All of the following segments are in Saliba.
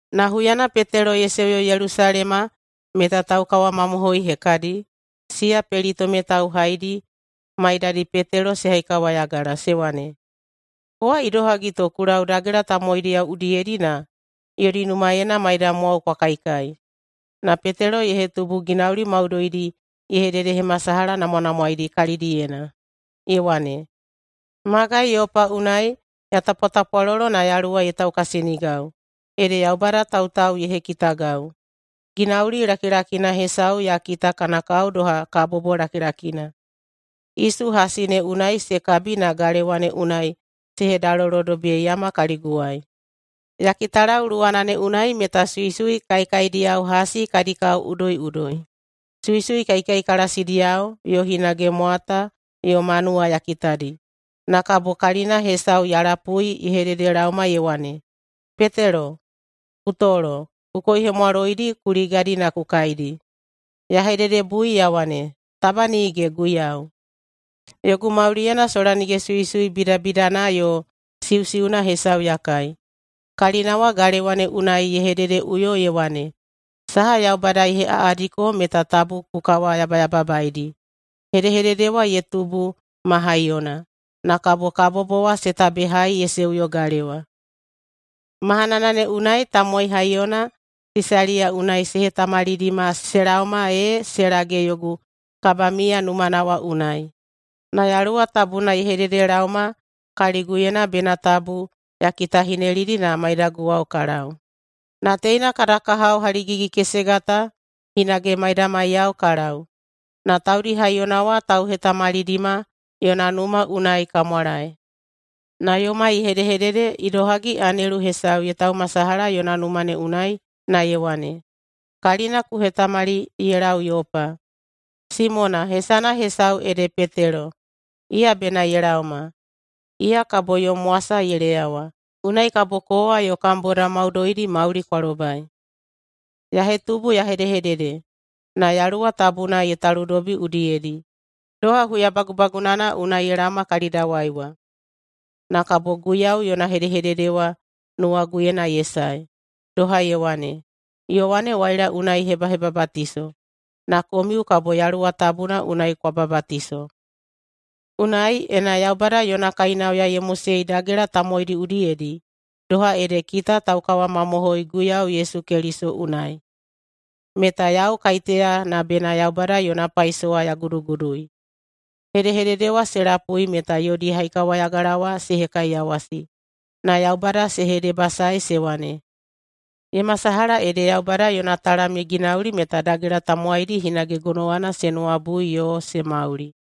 Na huyana Petelo ye seuyo Yelusalema meta taukawamamohoi hekadi, siya pelitome tauhaidi, maidadi Petelo se haikawayagala se wane, “Kowa idohagi to ku lau dagela tamowaidiyao udiyedi na yodi numaena maidamwao kwa kaikai.” Na Petelo ye hetubu ginauli maudoidi ye hededehemasalahanamwanamwaedi kalidiyena, ye wane, “Magai Yopa unai ya tapwatapwalolo na Yaluwa ye taukasinigau, ede Yaubada tautau ye hekitagau. Ginauli lakilakina hesau ya kita kana kao doha kabobo lakilakina, isu hasi ne unai se kabi na galewa ne unai se hedalolodobiyeiyama kaliguwai. Ya kitalau luwana ne unai meta suisui kaekaediyao hasi kadi kao udoiꞌudoi, suisui kaikaikalasidiyao, yo hinage mwata yo manuwa ya kitadi. Na kabo kalina hesau ya lapui ye hedehededelaoma ye wane, ‘Petelo, ku tolo. Ku koihemwaloidi ku ligadi na ku kaidi.’ Ya hededebui ya wane, ‘Taba nige, Guiyau! Yogu mauliyena sola nige suisui bidabidana yo siusiuna hesau ya kai.’ Kalina wa galewa ne unai ye hedehededeꞌuyo ye wane, ‘Saha Yaubada ye heꞌaꞌadiko meta tabu ku kawayabayababaedi.’ Hedehedede wa ye tubu ma haiyona, na kabo kabobo wa se tabehai ye seuyo galewa. Mahanana ne unai tamowai haiyona Sisaliya unai se hetamalidima se laoma ee se lage yogu kabamiya numana wa unai. Na Yaluwa Tabuna ye hededelaoma kaliguyena bena tabu ya kitahinelidi na maiyaguwao ka lau. Na teina kada kahao haligigi-kesega ta hinage maidamaiyao ka lau, na taudi haiyona wa tauhetamalidima yona numa unai ka mwalae. Na yomai ye hedehedede idohagi anelu hesau ye taumasalaha yona numa ne unai na ye wane, ‘Kalina ku hetamali ye lau Yopa, Simona, hesana hesau ede Petelo, iya bena ye laoma. Iya kabo yom wasa ye leyawa, unai kabo kowa yo kam bodao maudoidi mauli kwa lobai.’ Ya hetubu ya hedehedede, na Yaluwa Tabuna ye taludobi udiyedi, doha huya bagubagunana unai ye laoma kalidawai wa. Na kabo Guiyau yona hedehedede wa nuwaguyena ye sae, doha ye wane, ‘Yowane waila unai ye hebahebabatiso, na komiu kabo Yaluwa Tabuna unai kwa babatiso.’ Unai, ena Yaubada yona kainauya ye mosei dagela tamowaidi udiyedi doha ede kita taukawamamohoi Guiyau Yesu Keliso unai, meta yau kaiteya na bena Yaubada yona paisowa ya gudugudui?” Hedehedede wa se lapui meta yodi haikawayagala wa se hekaiyawasi, na Yaubada se hedebasaei se wane, “Ye masalaha ede Yaubada yona talam ye ginauli meta dagela tamowaidi hinage gonowana se nuwabui yo se mauli.”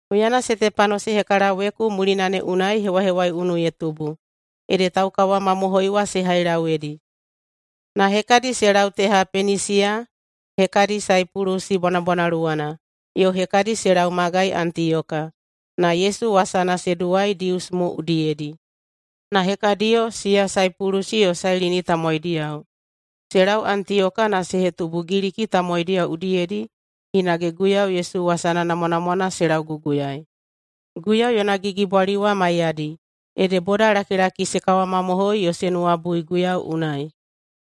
Huyana Setepano se hekalaweku mulina ne unai hewahewaiunu ye tubu, ede taukawamamohoi wa se hailauyedi. Na hekadi se lau teha Penisiya, hekadi Saipulusi bwanabwanaluwana, yo hekadi se lau magai Antiyoka, na Yesu wasana se duwai Dius mo udiyedi. Na hekadiyo, siya Saipulusi yo Sailini tamowaidiyao, se lau Antiyoka na se hetubu Giliki tamowaidiyao udiyedi hinage Guiyau Yesu wasana namwanamwana se lauguguyaei. Guiyau yona gigibwali wa maiyadi, ede bodalakilaki se kawamamohoi yo se nuwabui Guiyau unai.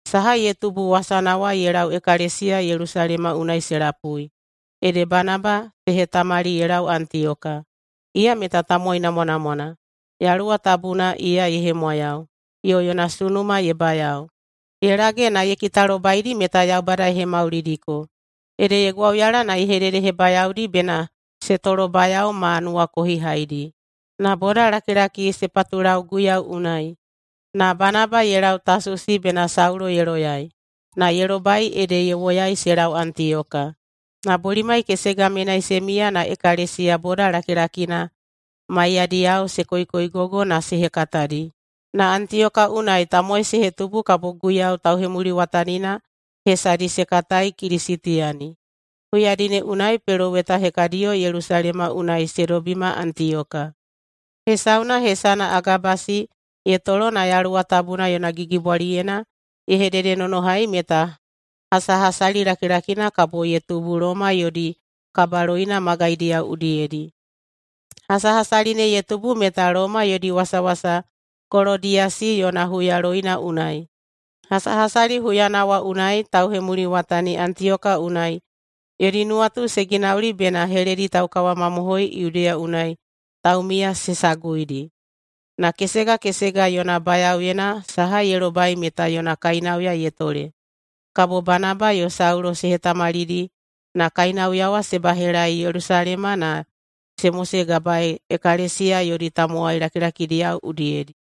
Saha ye tubu wasana wa ye lau ekalesiya Yelusalema unai se lapui. Ede Banaba se hetamali ye lau Antiyoka. Iya meta tamowai namwanamwana. Yaluwa Tabuna iya ye hemwayau, yo yona sunuma ye bayao. Ye lage na ye kitalobaidi meta Yaubada ye hemaulidiko, ede ye gwauyala na ye hededehebayaodi bena se tolobayao ma nuwakohihaidi. Na bodalakilaki se patulau Guiyau unai. Na Banaba ye lau Tasusi bena Saulo ye loyai, na ye lobai ede ye woyai se lau Antiyoka. Na bolimai kesega menai se miya na ekalesiya boda lakilakina maiyadiyao se koikoigogo na se hekatadi. Na Antiyoka unai tamowai se hetubu kabo Guiyau tauhemuliwatanina hesadi se katai Kilisitiyani. Huyadi ne unai peloweta hekadiyo Yelusalema unai se dobima Antiyoka. Hesauna hesana Agabasi ye tolo na Yaluwa Tabuna yona gigibwaliyena ye hededenonohai meta hasahasali lakilakina kabo ye tubu Loma yodi kabaloina magaidiyao udiyedi. Hasahasali ne ye tubu meta Loma yodi wasawasa Kolodiyasi yona huyaloina unai. Hasahasali huyana wa unai tauhemuliwatani Antiyoka unai yodi nuwatu se ginauli bena heledi taukawamamohoi Yudeya unai taumiya se saguidi. Na kesega kesega yona bayaoyena saha ye lobai meta yona kainauya ye tole. Kabo Banaba yo Saulo se hetamalidi na kainauya wa se bahelaei Yelusalema na se mosegabaei ekalesiya yodi tamowai lakilakidiyao udiyedi.